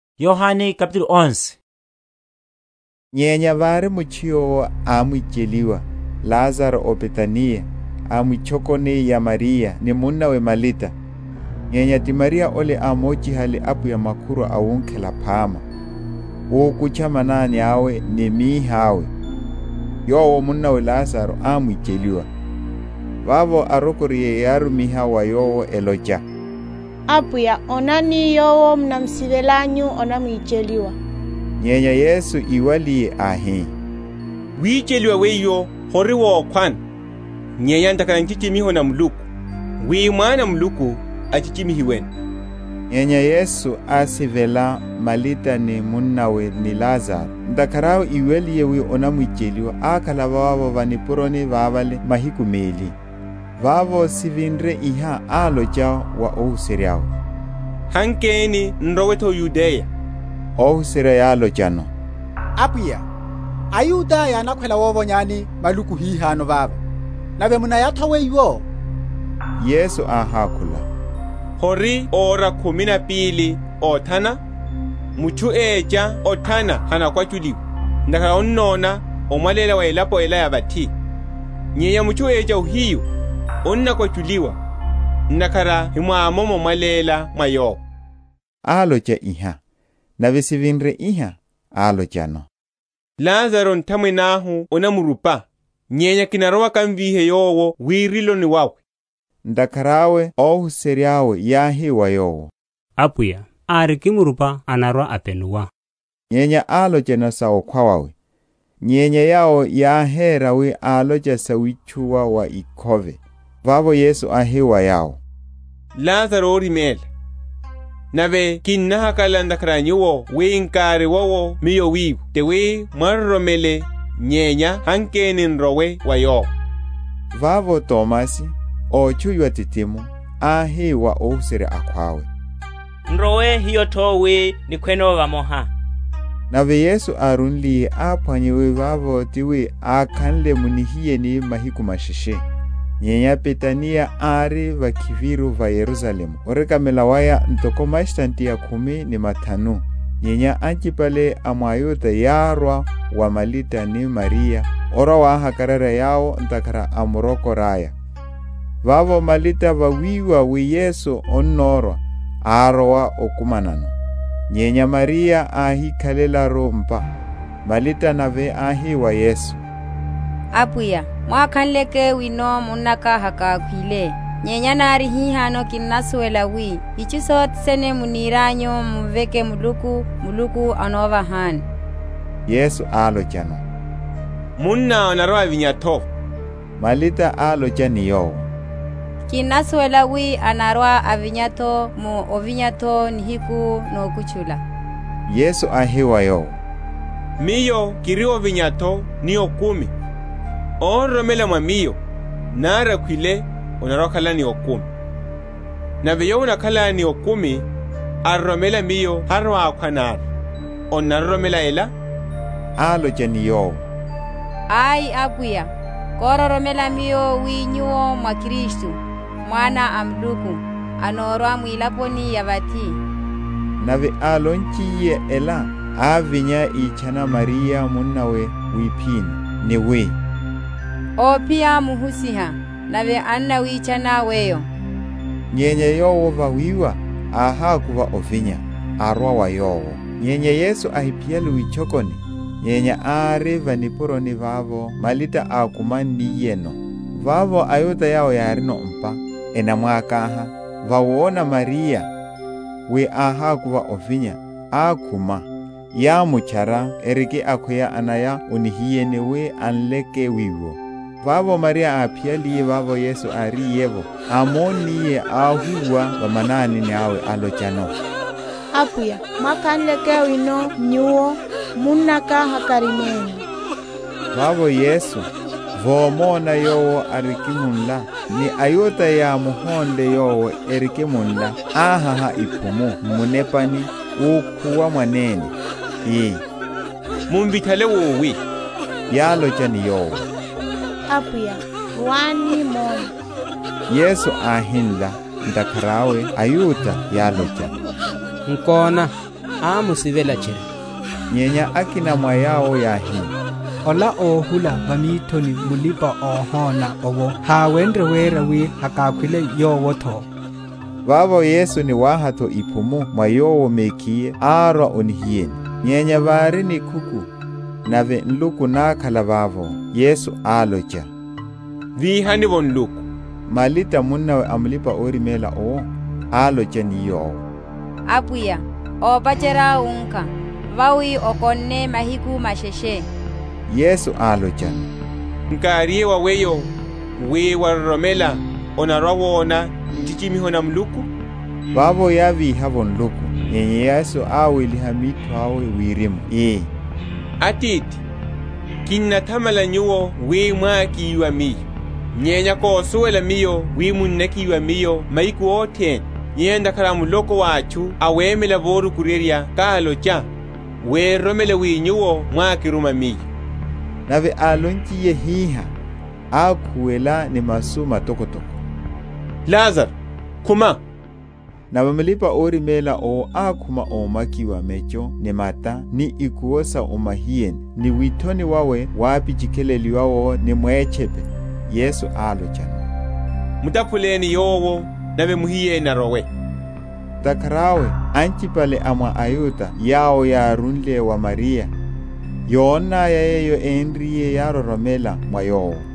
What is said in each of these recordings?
Ovíhiwa wa Lazaro. Nyenya vári mutchu yowo ámwicheliwa, Lazaro ó Betaniya, a mwitchokoni ya Mariya ni munnawe Malita. Nyenya ti Mariya ole ámochihale Apwiya makhurwa awunkhela phama, úkutcha manani awe ni mihi awe, yowo munnawe Lazaro ámwicheliwa. Vavo arokoriye yárumiha wa Yowo, elocha, Apwiya, onani, yowo munamsivelanyu anamwicheliwa. Nyenya Yesu íwaliye, áhi, Wicheliwa wiwo hori wokhwano, nyenya ntakhara a nchichimiho na Muluku, wi Mwana a Muluku achichimihiweno. Nyenya Yesu ásivela Malita, ni munnawe, ni Lazaro. Ntakhara awe íwaliye wi anamwicheliwa ákhala vavo va nipuroni vavale mahiku meli. Vavo sivinre iha, álocha wa óhuserya’we, Hankeni n’rowe’tho o Yudeya. Óhuserya yálochano, Apwiya, aYuda yánakhwela wovonyani maluku hihano vava; nave munnaya’tho wiwo? Yesu áhákhula, Hori ora khumi na pili othana? Mutchu écha othana hanakwachuliwa, ntakhara annona omwaléla wa elapo ela ya vathi. Nyenya mutchu écha ohiyu, anakwachuliwa, ntakhara hemwamomo omwaléla mwa Yowo. Álocha iha, nave sivinre iha, álochano, Lazaro nthamwene ahu anamrupa; nyenya kinarowa kamvíhe yowo wiriloni wawe. Ntakhara awe óhuserya’we yáhi wa Yowo, Apwiya, árikimrupa anarwa‐apenuwa. Nyenya álocha sa okhwa wawe: nyenya yawo yáhera wi álocha sa witchuwa wa ikhove. Vavo Yesu áhi wa yawo, Lazaro óriméla. Nave kinnahakalala ntakhara a nyuwo wi nkáriwowo Miyo wiwo, tiwi mwaroromele; nyenya hankeni n’rowe wa yowo. Vavo Tomasi, ótchuwiwa Didimo, áhi wa óhuserya akhwawe, N’rowe hiyo’tho wi nikhweno vamoha. Nave Yesu árúliye áphwanya wi vavo tiwi akhanle mu nihiyeni mahiku masheshe. Nyenya Betaniya ári vakhiviru va Yerusalemu orekamela waya ntoko mastadiya khumi ni mathanu; nyenya anchipale a mwa aYuda yárwa wa Malita ni Mariya, orwa‐wahakararya yawo ntakhara a murokoraya. Vavo Malita, vawiwa wi Yesu annorwa, árowa okumanano; nyenya Mariya áhikhalelaru m’pa. Malita nave áhi wa Yesu, Apwiya, mwákhanleke wino munnaka hakákhwile. Nyenya nari hihano kinnasuwela wi, itchu sothe sene munirianyu mumveke Muluku, Muluku anovahani. Yesu álochano, Munná anarwa‐avinya’tho. Malita álocha ni Yowo, Kinnasuwela wi anarwa‐avinya’tho mu ovinya’tho nihiku nokutchula. Yesu áhi wa yowo, Miyo kiri ovinya’tho ni okumi: óroromela mwa Miyo, nari akhwile, anarwa‐akhala ni okumi: nave yowo anakhala ni okumi, aroromela Miyo harwa‐akhwa nari. Onnaroromela ela? Álocha ni Yowo, Ai Apwiya: kororomela miyo wi Nyuwo mwá Kristu, Mwana a Muluku, anorwa mwilaponi ya vathi. Nave álonchiye ela, ávinya ítchana Mariya munnawe wiphini, ni wi, Óphiya Muhusiha, nave annawitchana weyo. Nyenya yowo, vawiwa, áhakuva ovinya, arwa wa Yowo. (Nyenya Yesu ahiphiyale witchokoni, nyenya ari va nipuroni vavo Malita ákumanniyeno.) Vavo, aYuda, yawo yárino m’pa, enamwakaha, vawona Mariya, wi áhakuva ovinya, akhuma, yámutchara, eriki akhweya anaya o nihiyeni wi anleke wiwo. Vavo Mariya, áphiyaliye vavo Yesu áriye’vo, ámonniye, áhúwa va manani awe, álochano, Apwiya, mwákhanleke wino Nyuwo, munnaka hakáriménle. Vavo Yesu, vomona yowo arikimunla, ni aYuda yámuhónle yowo erikimunla, áháha‐iphumu m’munepani, úkhuwa mwanene, ii, Mumvithale wowi? Yálocha ni Yowo, Apwiya, rwani, mone. Yesu áhinla. Ntakhara awe aYuda yálocha, Nkona, ámusivela tchiri! Nyenya akina mwa yawo yáhi, Ola óhula va mithoni mulipa‐ohona owo, háwenrye wera wi hakákhwile yowo’tho. Vavo Yesu, ni wahatho iphumu mwa Yowo mekhiye árwa o nihiyeni. Nyenya vári nikhuku, nave nluku nákhala vavo. Yesu álocha, Víhani’vo nluku. Malita, munnawe a mulipa‐oriméla owo, álocha ni Yowo, Apwiya, ópacherya wunkha: vawi okonne mahiku masheshe. Yesu álochano, Nkáriye wa weyo, wi, waroromela, onarwa‐wona nchichimiho na Muluku? Vavo yávíha’vo nluku. Nyenya Yesu áweliha mitho awe wirimu ii, Atithi, kinnathamala Nyuwo wi mwákiwa Miyo. Nyenya kosuwela Miyo wi munnakiwa Miyo mahiku othene: nyenya ntakhara a muloko wa atchu awemela vorukuryerya kálocha, wi eroromele wi Nyuwo mwákiruma Miyo. Nave álonchiye hiha, ákhuwela ni masu matokotoko, Lazaro, khuma. Nave mulipa‐oriméla owo ákhuma ómakiwa mecho ni mata ni ikuwo sa o mahiyeni; ni withoni wawe wapichikhileliwa ni mwétchepe. Yesu álochano, Mutaphuleni yowo, nave muhiyeni arowe. Ntakhara awe anchipale a mwa aYuda yawo yárúle wa Mariya, yonnaya yeyo énriye, yároromela mwa Yowo.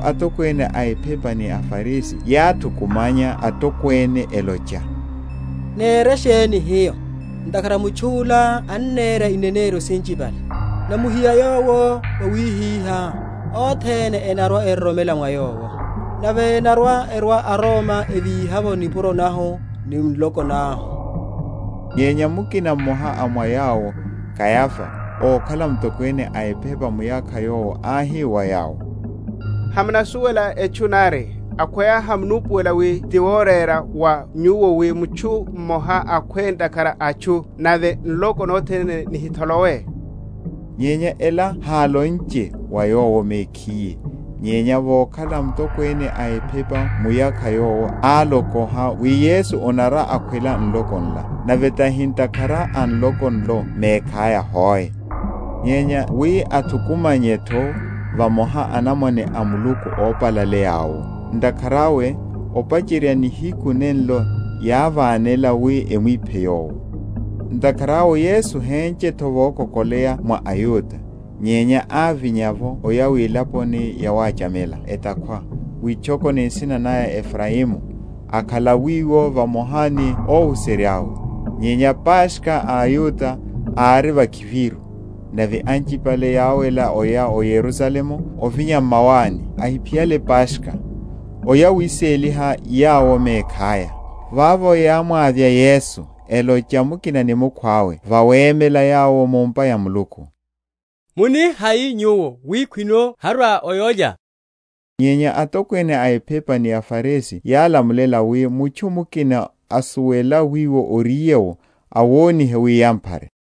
Vavo atokwene a ephepa ni aFarisi yáthukumanya atokwene, elocha, Nére sheni hiyo? ntakhara mutchu’la annera ineneryo sinchipale. Namuhiya Yowo wawihihá, othene enarwa‐eroromela mwa Yowo; nave enarwa‐erwa aRoma evíha’vo nipuro nahu ni nloko nahu. Nyenya mukina mmoha a mwa yawo, Kayafa, ókhala mutokwene a ephepa muyakha yowo áhi wa yawo, Hamunasuwela etchu nari, akhweya hamunupuwela wi ti worera wa nyuwo wi mutchu mmoha akhwe ntakhara a atchu, nave nloko nothene nihitholowe. Nyenya ela hálonche wa yowo mekhiye; nyenya vokhala mutokwene a ephepa muyakha yowo álokoha wi Yesu anarwa‐akhwela nloko nlo; nave tahi ntakhara a nloko nlo mekhaya hoe, nyenya wi athukumanye’tho vamoha anamwane a Muluku ópalaleya’wo. Ntakhara awe, opacherya nihiku nenlo yávanela wi emwiphe Yowo. Ntakhara awe Yesu héchenche’tho vokokoleya mwa aYuda, nyenya ávinya’vo oya wilaponi yawachamela etakhwa, witchokoni nsina naya Efraimu; akhala wiwo vamoha ni óhuserya’we. Nyenya Paskha a aYuda ári vakhiviru; nave anchipale yáwela oya o Yerusalemu ovinya m’mawani, ahiphiyale Paskha, oya wiséliha yawo mekhaya. Vavo yámmwavya Yesu, elocha mukina ni mukhwawe vawemela yawo mu’mpa ya Muluku, Muni hai nyuwo, wi khwino harwa o yólya? Nyenya atokwene a ephepa ni aFarisi yálamulela, wi, mutchu mukina asuwela wiwo oriye’wo, awonihe, wi yamphare.